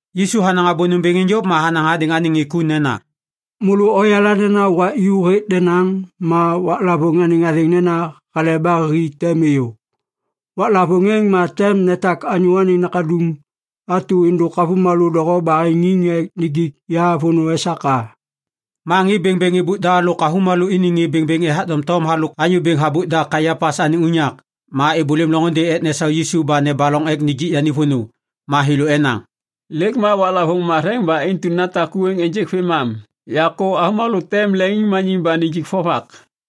Yisu hanaŋ abô nômbêŋ êŋ yôv ma hanaŋ hadêŋ anêŋ ŋê ku nena, “Môlô oyala nena wak ju hêk denaŋ ma waklavôŋ anêŋ athêŋ nena Hale ba Hi tem êyô. Waklavôŋ êŋ ma tem netak ya Anyô Anêŋ Nakaduŋ atu êndôk avômalô doho baheŋiŋ ek nijik ya vônô esak a.” Ma ŋê bêŋbêŋ êbôk da lôk avômalô iniŋ ŋê bêŋbêŋ ethak doŋtom halôk anyô bêŋ habôk da Kaiapas anêŋ unyak. Ma êbôlêm loŋôndê ek nesau Yisu ba nebaloŋ ek nijik yani vônô. Ma thêlô enaŋ, “Lêk ma waklavôŋ matheŋ ba intu natak ku êŋ ênjêk vêmam. Yakô avômalô tem leŋiŋmaniŋ ba nijik vovak.”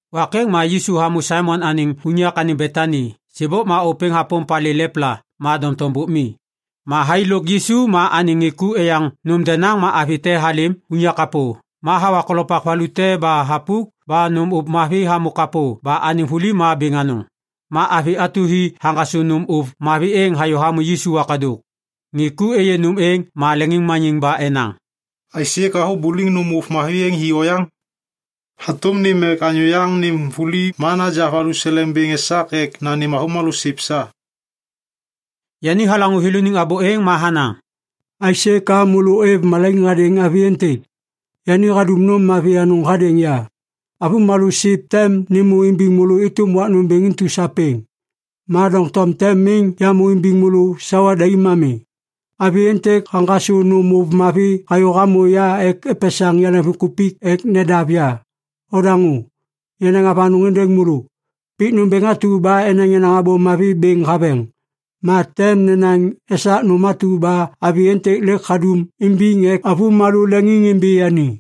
Wak êŋ ma Yisu hamô Saimon anêŋ unyak anêŋ Betani. Sêbôk ma ôpêŋ hapôm palê lepla ma doŋtom bôk mi. Ma thai lôk Yisu ma anêŋ ŋê ku eyaŋ nôm denaŋ ma avi te halêm unyak kapô. Ma hawa kolopak valu te ba thapuk ba nôm ôv mavi hamô kapô ba anêŋ vuli ma bêŋ anôŋ. Ma avi atu hi haŋgasô nôm ôv mavi êŋ hayô hamô Yisu wakadôk. Ŋê ku êyê nôm êŋ ma leŋiŋmaniŋ ba enaŋ, “Aisê ka habuliŋ nôm ôv mavi êŋ hi oyaŋ? Hatôm nêm ek anyô yaŋ nêm vuli ma naja valuseleŋ bêŋ esak ek nanêm avômalô siv sa.” Yani halaŋô thêlôniŋ abô êŋ ma hanaŋ, “Aisê ka môlô ôêv malaiŋ hadêŋ avi êntêk? Yani hadum nôm mavi anôŋ hadêŋ ya. Avômalô siv tem nêmô imbiŋ môlô êtôm wak nômbêŋ intu sapêŋ. Ma doŋtom tem miŋ yamô imbiŋ môlô sawa daim ami. Avi êntêk haŋgasô nôm ôv mavi hayô hamô ya ek epesaŋ yaleŋviŋkupik ek nedav ya. Odaŋô! Yanaŋ avanôŋ êndêŋ môlô! Pik nômbêŋ atu ba enaŋ yenaŋ Abô Mavi bêŋ haveŋ, ma tem nenaŋ esak nôm atu ba avi êntêk lêk hadum imbiŋ ek avômalô leŋiŋimbi yani.”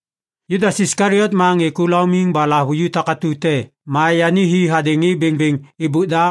Judas Iskaliot ma ŋê ku laumiŋ ba lahavuju takatu te ma yani hi hadêŋ ŋê bêŋbêŋ êbôk da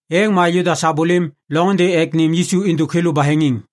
Êŋ ma Judas habôlêm loŋôndê ek nêm Yisu êndôk thêlô baheŋiŋ.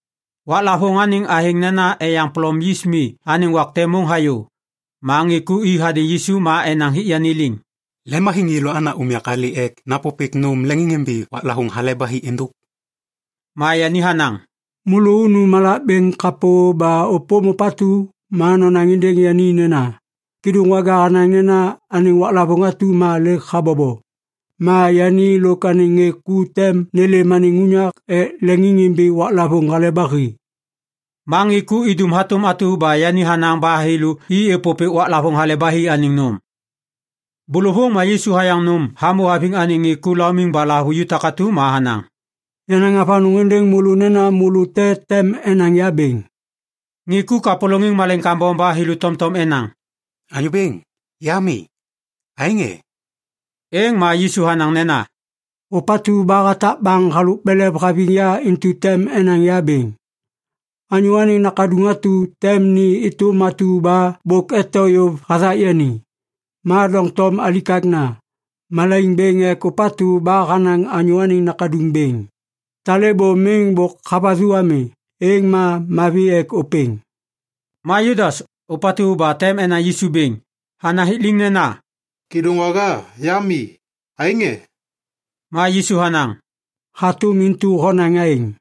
Waklavôŋ anêŋ athêŋ nena Eyaŋ Polom Yis Mi anêŋ wak te môŋ hayô. Ma ŋê ku i hadêŋ Yisu ma enaŋ hik yani liŋ, “Lemhaviŋ yêlô ana unyak alê ek napôpêk nôm leŋiŋimbi waklavôŋ Hale ba Hi êndôk?” Ma yani hanaŋ, “Môlô unu malak bêŋ kapô ba ôpôm ôpatu ma nonaŋ êndêŋ yani nena, ‘Kêdôŋwaga hanaŋ nena anêŋ waklavôŋ atu ma lêk habobo. Ma yani lôk anêŋ ŋê ku tem nêlêm anêm unyak ek leŋiŋimbi waklavôŋ Hale ba Hi.’” Ma ŋê ku idum hatôm atu ba yani hanaŋ ba thêlô i êpôpêk waklavôŋ Hale ba Hi anêŋ nôm. Bôlôvôŋ ma Yisu hayaŋ nôm hamô haviŋ anêŋ ŋê ku laumiŋ ba lahavuju takatu ma hanaŋ, “Yanaŋ avanôŋ êndêŋ môlô nena môlô te tem enaŋ ya bêŋ.” Ŋê ku kapôlôŋiŋ malaiŋ kambom ba thêlô tomtom enaŋ, “Anyô Bêŋ, ya mi! Aêŋ e?” Êŋ ma Yisu hanaŋ nena, “Ôpatu ba hatak baŋ halôk belev haviŋ ya intu tem enaŋ ya bêŋ. Anyô Anêŋ Nakaduŋ atu tem ni êtôm atu ba bôk eto yôv hathak yani. Ma doŋtom alikakna. Malaiŋ bêŋ ek ôpatu ba hanaŋ Anyô Anêŋ Nakaduŋ bêŋ. Talêbô miŋ bôk havathu ami, êŋ ma mavi ek ôpêŋ!” Ma Judas, ôpatu ba tem enaŋ Yisu bêŋ, hanaŋ hik liŋ nena, “Kêdôŋwaga, ya mi! Aêŋ e?” Ma Yisu hanaŋ, “Hatôm intu honaŋ aêŋ.”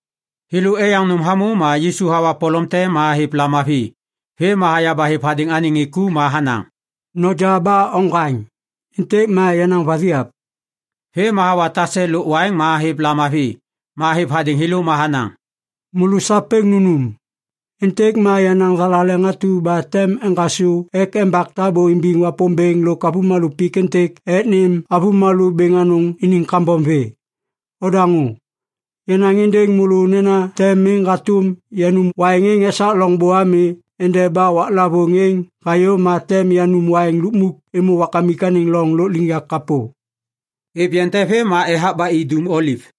Thêlô eyaŋ nôm hamô ma Yisu hawa polom te ma hêv lamavi. Vêm ma haya ba hêv hadêŋ anêŋ ŋê ku ma hanaŋ, “Noja ba oŋgwaŋ. Êntêk ma yenaŋ vathiap.” Vêm ma hawa tase lôk waiŋ ma hêv lamavi. Ma hêv hadêŋ thêlô ma hanaŋ, “Môlô sapêŋ nunum. Êntêk ma yenaŋ thalaleŋ atu ba tem eŋgasô ek embak tabô imbiŋ Wapômbêŋ lôk avômalô pik êntêk ek nêm avômalô bêŋ anôŋ iniŋ kambom vê. Odaŋô! Yanaŋ êndêŋ môlô nena tem miŋ hatôm yanum waiŋ êŋ esak loŋbô ami endeba waklavôŋ êŋ hayô ma tem yanum waiŋ lukmuk êmô Wakamik anêŋ loŋ lôkliŋyak kapô.” Êv yeŋ te vêm ma ethak ba i Dum Oliv.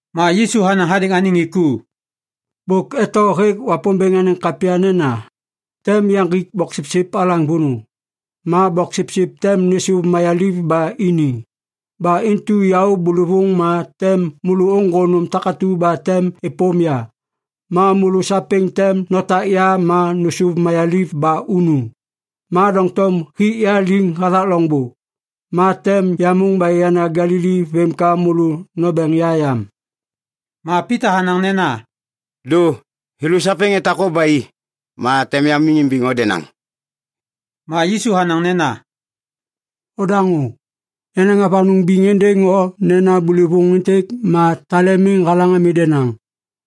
Ma Yisu hanaŋ hadêŋ anêŋ ŋê ku, “Bôk eto hêk Wapômbêŋ anêŋ kapya nena, “‘Tem yaŋgik boksipsip alaŋ vônô, ma boksipsip tem nêsôv mayaliv ba ini.’ Ba intu yaô bôlôvôŋ ma tem môlô ôŋgô nôm takatu ba tem êpôm ya. Ma môlô sapêŋ tem notak ya ma nôsôv mayaliv ba unu. Ma doŋtom hik ya liŋ hathak loŋbô, ma tem yamôŋ ba yana Galili vêm ka môlô nombeŋ ya yam.” Ma Pita hanaŋ nena, “Dô! Thêlô sapêŋ etak o ba i, ma tem yamiŋ imbiŋ o denaŋ.” Ma Yisu hanaŋ nena, “Ondaŋô! Yanaŋ avanôŋ biŋ êndêŋ o nena bôlôvôŋ êntêk ma tale miŋ halaŋ ami denaŋ,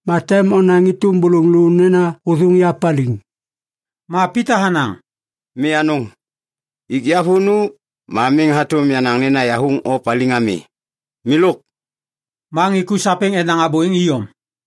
ma tem onaŋ êtôm bôlôŋ lô nena hôthôŋ ya paliŋ.” Ma Pita hanaŋ, “Mi anôŋ! Ik ya vônô, ma miŋ hatôm yanaŋ nena yahathôŋ o paliŋ ami. Milôk!” Ma ŋê ku sapêŋ enaŋ abô êŋ iyom.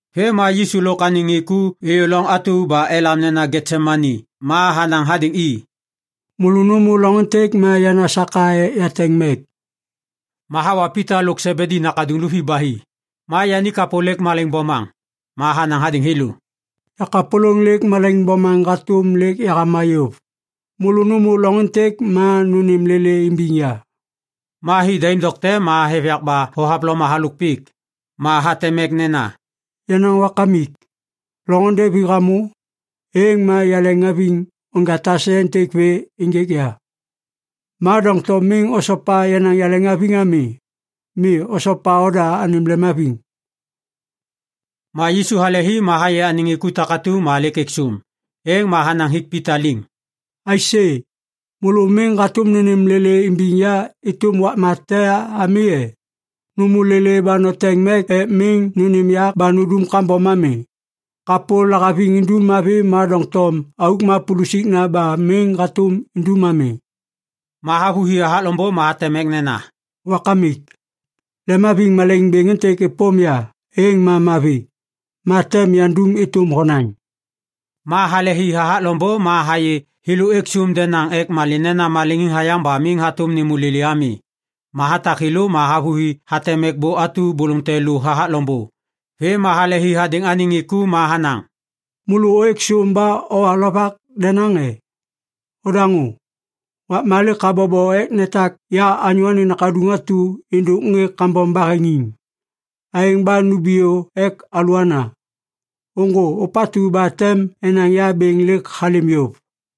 Vêm ma Yisu lôk anêŋ ŋê ku êyô loŋ atu ba elam nena Getsemani ma hanaŋ hadêŋ i, “Môlô nômô loŋ êntêk ma yana saka ek yateŋ mek.” Ma hawa Pita lôk Sebedi nakaduŋ luvi ba i. Ma yani kapô lêk malaiŋ bomaŋ. Ma hanaŋ hadêŋ thêlô, “Yakapôlôŋ lêk malaiŋ bomaŋ hatôm lêk yahama yôv. Môlô nômô loŋ êntêk ma nônêm lêlê imbiŋ ya.” Ma hi daim dokte ma hêv yak ba thohavloma halôk pik. Ma hateŋ mek nena, “Yenaŋ Wakamik, loŋôndê vi hamô, êŋ ma yaleŋhaviŋ onja tase êntêk vê ênjêk ya. Ma doŋtom miŋ osopa yenaŋ yaleŋhaviŋ ami. Mi, osopa oda anêm lemhaviŋ.” Ma Yisu hale hi ma hayê ŋê ku takatu ma lêk êk sôm. Êŋ ma hanaŋ hik Pita liŋ, “Aisê? Môlô miŋ hatôm nônêm lêlê imbiŋ ya êtôm wakma te ami e? Nômô lêlê ba noteŋ mek ek miŋ nônêm yak ba nundum kambom ami. Kapô lahaviŋ indum mavi ma doŋtom auk ma pulusikna ba miŋ hatôm indum ami.” Ma havôhi hathak loŋbô ma hateŋ mek nena, “Wakamik, lemhaviŋ malaiŋ bêŋ êntêk êpôm ya, êŋ ma mavi. Ma tem yandum êtôm honaŋ.” Ma halehi hathak loŋbô ma hayê thêlô êk sôm denaŋ ek malê nena maleŋiŋ hayaŋ ba miŋ hatôm nêmô lêlê ami. Ma hatak thêlô ma havôhi hateŋ mek bô atu bôlôŋ te lu hathak loŋbô. Vêm ma halehi hadêŋ anêŋ ŋê ku ma hanaŋ, “Môlô ôêk sôm ba owa lovak denaŋ e? Odaŋô. Wakma lêk habobo ek netak ya Anyô Anêŋ Nakaduŋ atu êndôk ŋê kambom baheŋiŋ. Aêŋ ba numbiyô ek alôana! Ôŋgô! Ôpatu ba tem enaŋ ya bêŋ lêk halêm yôv!”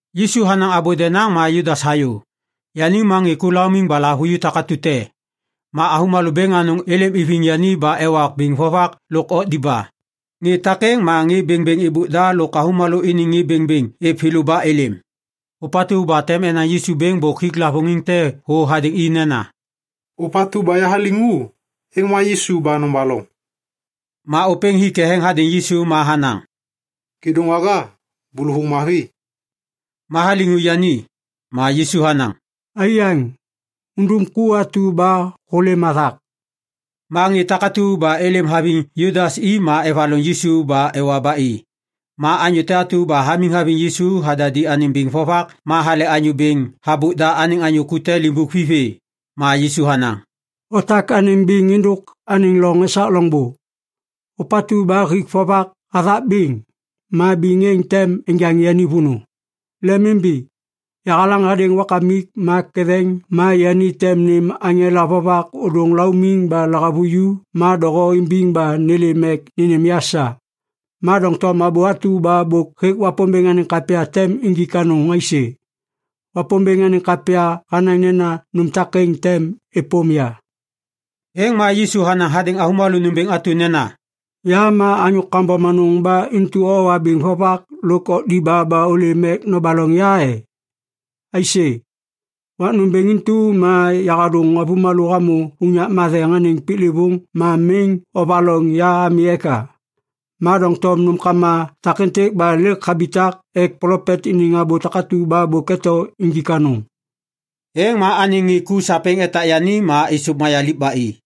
Yisu hanaŋ abô denaŋ ma Judas hayô. Yani ma ŋê ku laumiŋ ba lahavuju takatu te. Ma avômalô bêŋ anôŋ êlêm iviŋ yani ba ewa biŋ vovak lôk okdiba. Ŋê takêŋ ma ŋê bêŋbêŋ êbôk da lôk avômalô iniŋ ŋê bêŋbêŋ êv thêlô ba êlêm. Ôpatu ba tem enaŋ Yisu bêŋ bôk hik lavôŋiŋ te thô hadêŋ i nena, “Ôpatu ba yahaliŋu, êŋ ma Yisu ba nobaloŋ!” Ma ôpêŋ hi ketheŋ hadêŋ Yisu ma hanaŋ, “Kêdôŋwaga, bôlôvôŋ mavi.” Ma haliŋu yani. Ma Yisu hanaŋ, “Aiyaŋ, undum ku atu ba hôlêm hathak.” Ma ŋê takatu ba êlêm haviŋ Judas i ma evaloŋ Yisu ba ewa ba i. Ma anyô te atu ba hamiŋ haviŋ Yisu hadadi anêŋ biŋ vovak ma hale anyô bêŋ habôk da anêŋ anyô ku te limbuk vi vê. Ma Yisu hanaŋ, “Otak anêm biŋ êndôk anêŋ loŋ esak loŋbô! Ôpatu ba hik vovak hathak biŋ, ma biŋ êŋ tem enjaŋ yani vônô. Lemimbi! Yahalaŋ hadêŋ Wakamik ma ketheŋ ma yani tem nêm aŋela vovak ôdôŋ laumiŋ ba lahavuju ma doho imbiŋ ba nêlêm ek nênêm ya sa. Ma doŋtom abô atu ba bôk hêk Wapômbêŋ anêŋ kapya tem injik anôŋ aisê? Wapômbêŋ anêŋ kapya hanaŋ nena nôm takêŋ tem êpôm ya.” Êŋ ma Yisu hanaŋ hadêŋ avômalô nômbêŋ atu nena, “Ya ma anyô kambom anôŋ ba intu owa biŋ vovak lôk okdiba ba ôlêm ek nobaloŋ ya e? Aisê? Wak nômbêŋ intu ma yahadôŋ avômalô hamô unyak matheŋ anêŋ piklêvôŋ ma miŋ ovaloŋ ya ami eka? Ma doŋtom nômkama takêntêk ba lêk habitak ek plopet iniŋ abô takatu ba bôk eto injik anôŋ.” Êŋ ma anêŋ ŋê ku sapêŋ etak yani ma êsôv mayaliv ba i.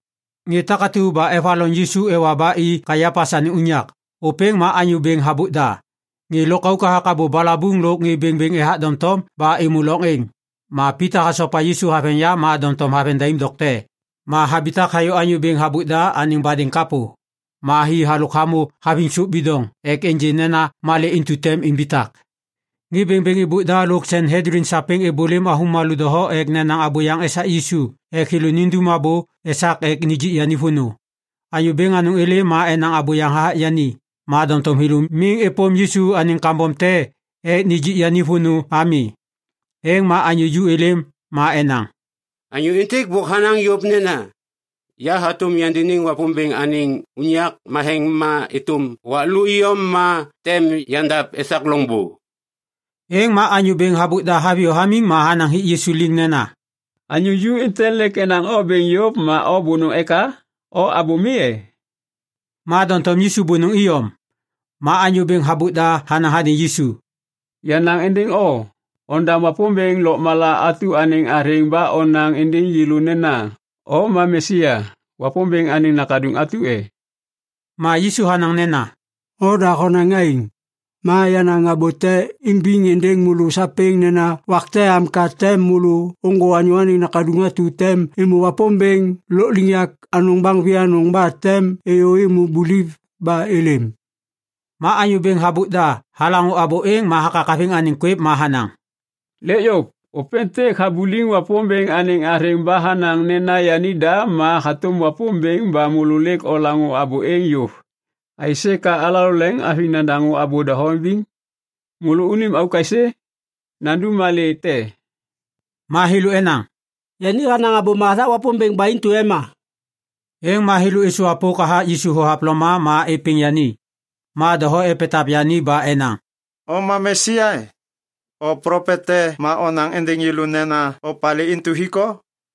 Ŋê takatu ba evaloŋ Yisu ewa ba i Kaiapas anêŋ unyak, ôpêŋ ma anyô bêŋ habôk da. Ŋê lôkauk hathak abô balabuŋ lôk ŋê bêŋbêŋ ethak doŋtom ba êmô loŋ êŋ. Ma Pita hasopa Yisu haveŋ yam ma doŋtom haveŋ daim dokte. Ma habitak hayô anyô bêŋ habôk da anêŋ badêŋ kapô. Ma hi halôk hamô haviŋ sôp bidoŋ ek ênjê nena malê intu tem imbitak. Ŋê bêŋbêŋ êbôk da lôk Sanhedlin sapêŋ êbôlêm avômalô doho ek nenaŋ abôyaŋ esak Yisu ek thêlô nindum abô esak ek nijik yani vônô. Anyô bêŋ anôŋ êlêm ma enaŋ abôyaŋ hathak yani, ma doŋtom thêlô miŋ êpôm Yisu anêŋ kambom te ek nijik yani vônô ami. Êŋ ma anyô ju êlêm ma enaŋ, “Anyô êntêk bôk hanaŋ yôv nena, ‘Yahatôm yandiniŋ Wapômbêŋ anêŋ unyak matheŋ ma êtôm wak lô iyom ma tem yandav esak loŋbô.’” Êŋ ma anyô bêŋ habôk da haviyô hamiŋ ma hanaŋ hik Yisu liŋ nena, “Anyô ju êntêk lêk enaŋ o bêŋ yôv ma o bônôŋ eka? O abô mi e?” Ma doŋtom Yisu bônôŋ iyom. Ma anyô bêŋ habôk da hanaŋ hadêŋ Yisu, “Yanaŋ êndêŋ o! Ondam Wapômbêŋ lôkmala atu anêŋ athêŋ ba onaŋ êndêŋ yêlô nena, ‘O ma Mesia, Wapômbêŋ anêŋ nakaduŋ atu e?’” Ma Yisu hanaŋ nena, “Oda honaŋ aêŋ. Ma yanaŋ abô te imbiŋ êndêŋ môlô sapêŋ nena wak te am ka tem môlô ôŋgô Anyô Anêŋ Nakaduŋ atu tem êmô Wapômbêŋ Lôkliŋyak Anôŋ baŋ vianôŋ ba tem êyô êmô buliv ba êlêm.” Ma anyô bêŋ habôk da halaŋô abô êŋ ma hakakaviŋ anêŋ kwêv ma hanaŋ, “Lêk yôv! Ôpêntêk habuliŋ Wapômbêŋ anêŋ athêŋ ba hanaŋ nena yanida ma hatôm Wapômbêŋ ba môlô lêk olaŋô abô êŋ yôv! Aisê ka alalô leŋiŋhaviŋ nadaŋô abô doho imbiŋ? Môlônim auk aisê? Yandum malê te?” Ma thêlô enaŋ, “Yani hanaŋ abôma hathak Wapômbêŋ ba intu ema.” Êŋ ma thêlô êsôvwapôk hathak Yisu thohavloma ma êpêŋ yani. Ma doho epetav yani ba enaŋ, “O ma Mesia e? O plopet te ma onaŋ êndêŋ yêlô nena opalê intu hik o?”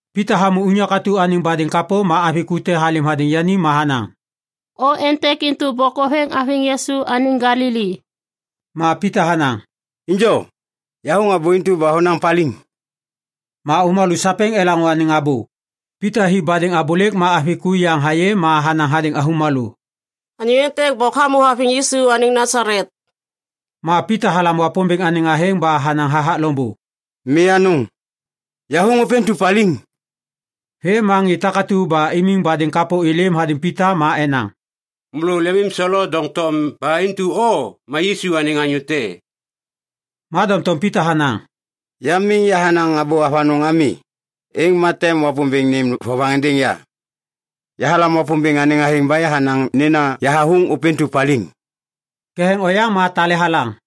Pita hamô unyak atu anêŋ badêŋ kapô ma avi ku te halêm hadêŋ yani ma hanaŋ, “O êntêk intu bôk hoveŋ haviŋ Yisu anêŋ Galili.” Ma Pita hanaŋ, “Injo! Yahathôŋ abô intu ba honaŋ paliŋ!” Ma avômalô sapêŋ elaŋô anêŋ abô. Pita hi badêŋ abôlêk ma avi ku yaŋ hayê ma hanaŋ hadêŋ avômalô, “Anyô êntêk bôk hamô haviŋ Yisu anêŋ Nasalet.” Ma Pita halam Wapômbêŋ anêŋ athêŋ ba hanaŋ hathak loŋbô, “Mi anôŋ! Yahathôŋ ôpêntu paliŋ!” Vêm ma ŋê takatu ba imiŋ badêŋ kapô êlêm hadêŋ Pita ma enaŋ, “Môlô lemimselo doŋtom ba intu o ma Yisu anêŋ anyô te.” Ma doŋtom Pita hanaŋ, “Ya miŋ yahanaŋ abô avanôŋ ami, êŋ ma tem Wapômbêŋ nêm vovaŋ êndêŋ ya. Yahalam Wapômbêŋ anêŋ athêŋ ba yahanaŋ nena yahathôŋ ôpêntu paliŋ!” Ketheŋ oyaŋ ma tale halaŋ.